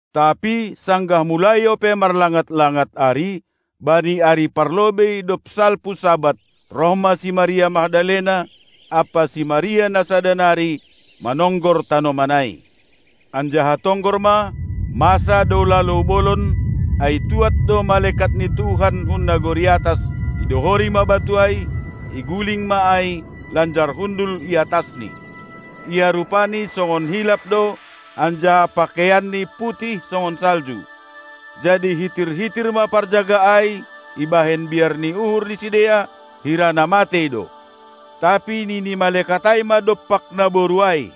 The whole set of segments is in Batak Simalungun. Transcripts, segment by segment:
Tapi sanggah mulai ope marlangat-langat ari, bani ari parlobei dob salpu Sabat, roh ma si Maria Magdalena ampa si Maria na sada nari manonggor tanoman ai. Anjaha tonggor ma, masa do lalou bolon, ai tuad do malekat ni Tuhan hun nagori atas, idohori ma batu ai, iguling ma ai lanjar hundul i atasni. Ia rupani songon hilap do, anjaha pakeianni putih songon salju. Jadi hitir-hitir ma parjaga ai ibahen biar ni uhur ni sidea, hira na matei do. Tapi nini malekat ai ma dompak naboru ai: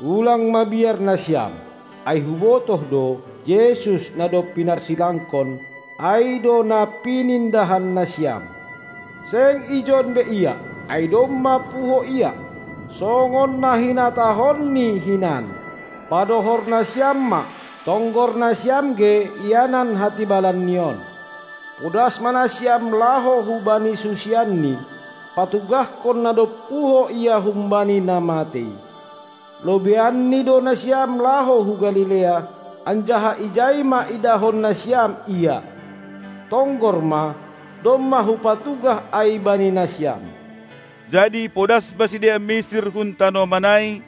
Ulang mabiar nasiam! Ai hubotoh do, Jesus, na dob pinarsilangkon, ai do na pinindahan nasiam. Seng ijon be Ia, ai domma puho Ia, songon na hinatahonNi hinan. Padohor nasiam ma, tonggor nasiam ge ianan hatibalanni on! Podas ma nasiam laho hubani susianNi patugahkon na dob puho Ia humbani na matei. Lobeianni do nasiam laho hu Galilea, anjaha ijai ma idahon nasiam Ia. Tonggor ma, domma hupatugah ai bani nasiam. Jadi podas ma sidea misir hun tanoman ai,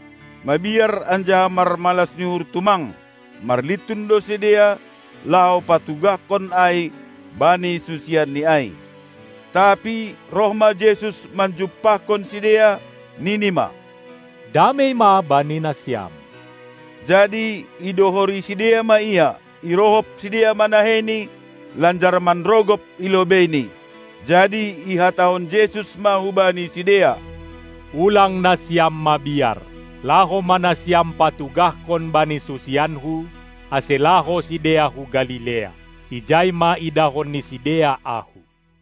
mabiar anjaha marmalas ni uhur tumang; marlintun do sidea laho patugahkon ai bani susianNi ai. Tapi roh ma Jesus manjumpahkon sidea, nini ma: Damei ma bani nasiam. Jadi idohori sidea ma Ia, irohop sidea ma naheiNi lanjar manrogop i lobeiNi. Jadi ihatahon Jesus ma hubani sidea: Ulang nasiam mabiar, laho ma nasiam patugahkon bani susianKu, ase laho sidea hu Galilea. Ijai ma idahon ni sidea Ahu!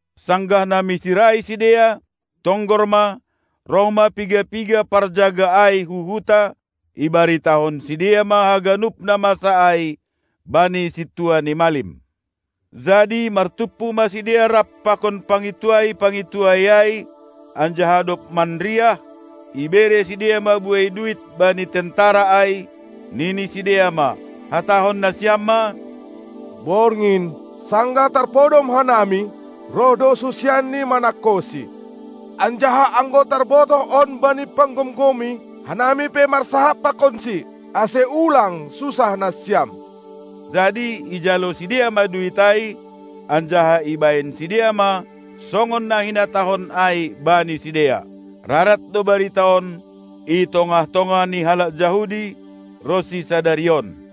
Sanggah na misir ai sidea, tonggor ma, roh ma piga-piga parjaga ai hu huta, ibaritahon sidea ma haganup na masa ai bani sintua ni malim. Jadi martumpu ma sidea rap pakon pangintuai-pangintuai ai, anjaha dob marriah, ibere sidea ma buei duit bani tentara ai, nini sidea ma: Hatahon nasiam ma: Borngin, sanggah tarpodom hanami, roh do susianNi manangkoSi. Anjaha anggo tarbotoh on bani panggomgomi, hanami pe marsahap pakonsi, ase ulang susah nasiam. Jadi ijalo sidea ma duit ai, anjaha ibahen sidea ma songon na hinatahon ai bani sidea. Rarat do barita on i tongah-tongah ni halak Jahudi ronsi sadari on.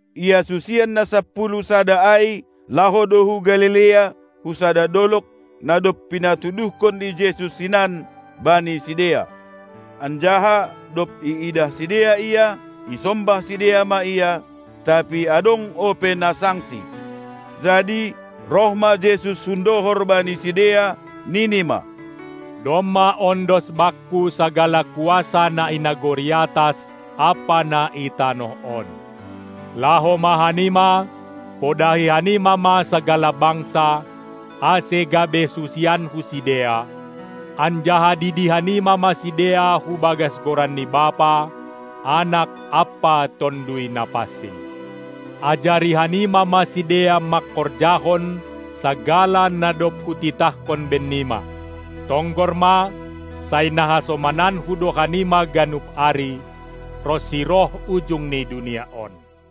Ia susian na sapuluh sada ai laho do hu Galilea, hu sada dolog, na dob pinatuduhkon ni Jesus hinan bani sidea. Anjaha dob iidah sidea Ia, isombah sidea ma Ia, tapi adong ope na sangsi. Jadi roh ma Jesus hundohor bani sidea, nini ma: Domma ondos Bakku sagala kuasa na i nagori atas ampa na i tanoh on. Laho ma hanima, podahi hanima ma sagala bangsa, ase gabe susianKu sidea, anjaha didi hanima ma sidea hu bagas goran ni Bapa, Anak ampa Tonduy Napansing. Ajari hanima ma sidea mangkorjahon sagala na dob hutitahkon bennima. Tonggor ma, sai na hasomananKu do hanima ganup ari, ronsi roh ujung ni dunia on.